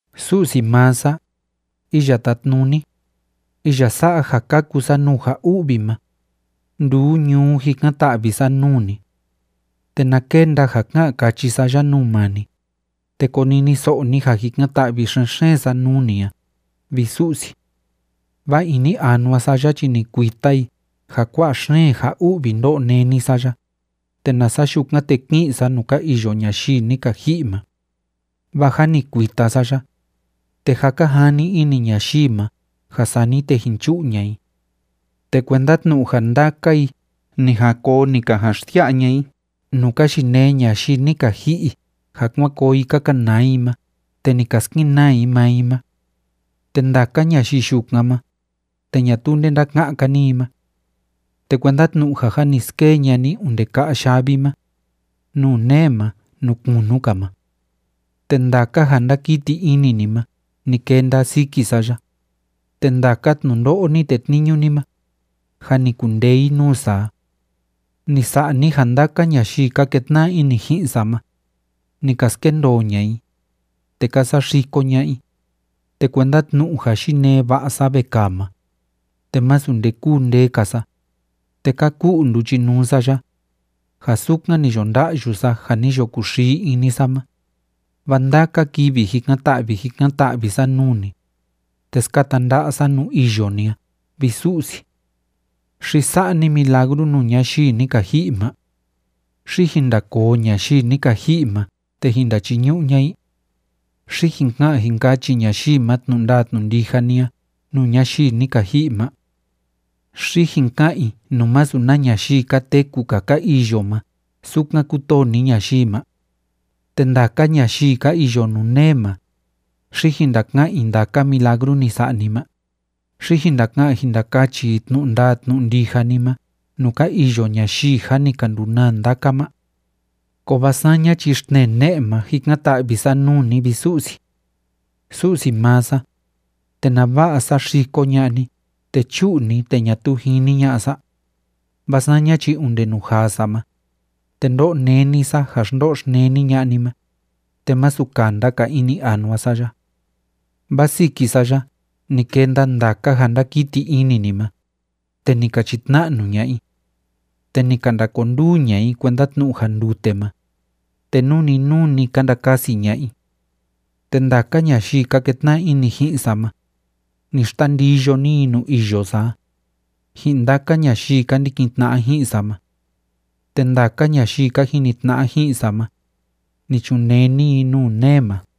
Su'si maa sa, Iya Tátnuni, iya sa'a ja kaku sa nuu ja u'vi ma, nduu ñuu jikan‑ta'vi sa nuu ni. Te na kenda ja ká'an káchi sa ya nuu maa ni, te koniniso'o ni ja jikan‑ta'vi xen‑xeen sa nuu ni a, vi Su'si. Vaa ini anua sa ya chi ni kuita i ja kua'a xeen ja u'vi ndó'o néni sa ya, te nasa yukan, te ki'in sa nuu ka iyo ñayii ni ka ji'i ma. Vaa jâ ni kuita sa ya, te jâ ka jani ini ñayii ma ja sani te jin chu'u ña'a i. Te kuenda tnu'u ja ndaka i ni jan koo ni ka jan xsia'a ña'a i nuu ka yinee ñayii ni ka ji'i ja kuan koo i ka kanaa i ma te ni ka skenaa i maa i ma. Te ndaka ñayii yukan ma, te ñatuu nde ndáka'án‑ka ni i ma. Te kuenda tnu'u ja jâ ni skee ña'a ni onde ka'a yavi ma, nuu nee ma, nuu kunu‑ka ma. Te ndaka ja ndákiti ini ni ma ni kenda siki sa ya, te ndaka tnundo'o ni tetniñu ni ma, jâ ni kundee i nuu sa a. Ni sa'a ni ja ndaka ñayii ka ketna'a ini ji'in sa ma, ni ka skendoo ña'a i, te ka saxiko ña'a i, te kuenda tnu'u ja yinee va'a sa vekaa ma, te masu nde kúu ndee‑ka sa. Te ka ku'u nduchinuu sa ya, ja sukan ni yo nda'yu sa ja ni yo kuxii ini sa ma, vaa ndaka kivi jikan‑ta'vi jikan‑ta'vi sa nuu ni, te skata nda'a sa nuu iyo ni a, vi Su'si. ¿Xi sa'a ni milagru nuu ñayii ni ka ji'i ma? ¿Xi jin ndakoo ñayii ni ka ji'i ma te jin ndachiñu'u ña'a i? ¿Xi jin ka'an jin kachi ñayii ma tnu'u ndaa tnu'u ndija ni a nuu ñayii ni ka ji'i ma? ¿Xi jin ka'an i nuu masu na ñayii ka teku‑ka ka iyo ma sukan kútoo ni ñayii ma? ¿Te ndaka ñayii ka iyo nuu nee ma, xi jin ndaka'án i ndaka milagru ni sa'a ni ma? ¿Xi jin ndaka'an jin ndakachi i tnu'u ndaa tnu'u ndija ni ma nuu ka iyo ñayii jâ ni ka ndunaa ndaka ma? Kovaa saña chi xtnee ne'e ma jikan‑ta'vi sa nuu ni, vi Su'si. ¿Su'si maa sa, te nava'a saxiko ña'a ni te chu'u ni te ñatuu jini ña'a sa? Vaa saña chi onde nuu jaa sa ma, te ndó'o néni sa ja xndo'o xneni ña'a ni ma, te masu kanda‑ka ini anua sa ya. Vaa siki sa ya ni kenda ndaka ja ndákiti ini ni ma, te ni ka chitna'nu ña'a i. Te ni ka ndakonduu ña'a i kuenda tnu'u ja ndute ma, te nuu‑ni nuu‑ni ka ndakasi ña'a i. Te ndaka ñayii ka ketna'a ini ji'in sa ma, ni xtandiyo ni i nuu iyo sa a, ji'in ndaka ñayii ka ndikin tna'a ji'in sa ma. Te ndaka ñayii ka jini tna'a ji'in sa ma, ni chunee ni i nuu nee ma.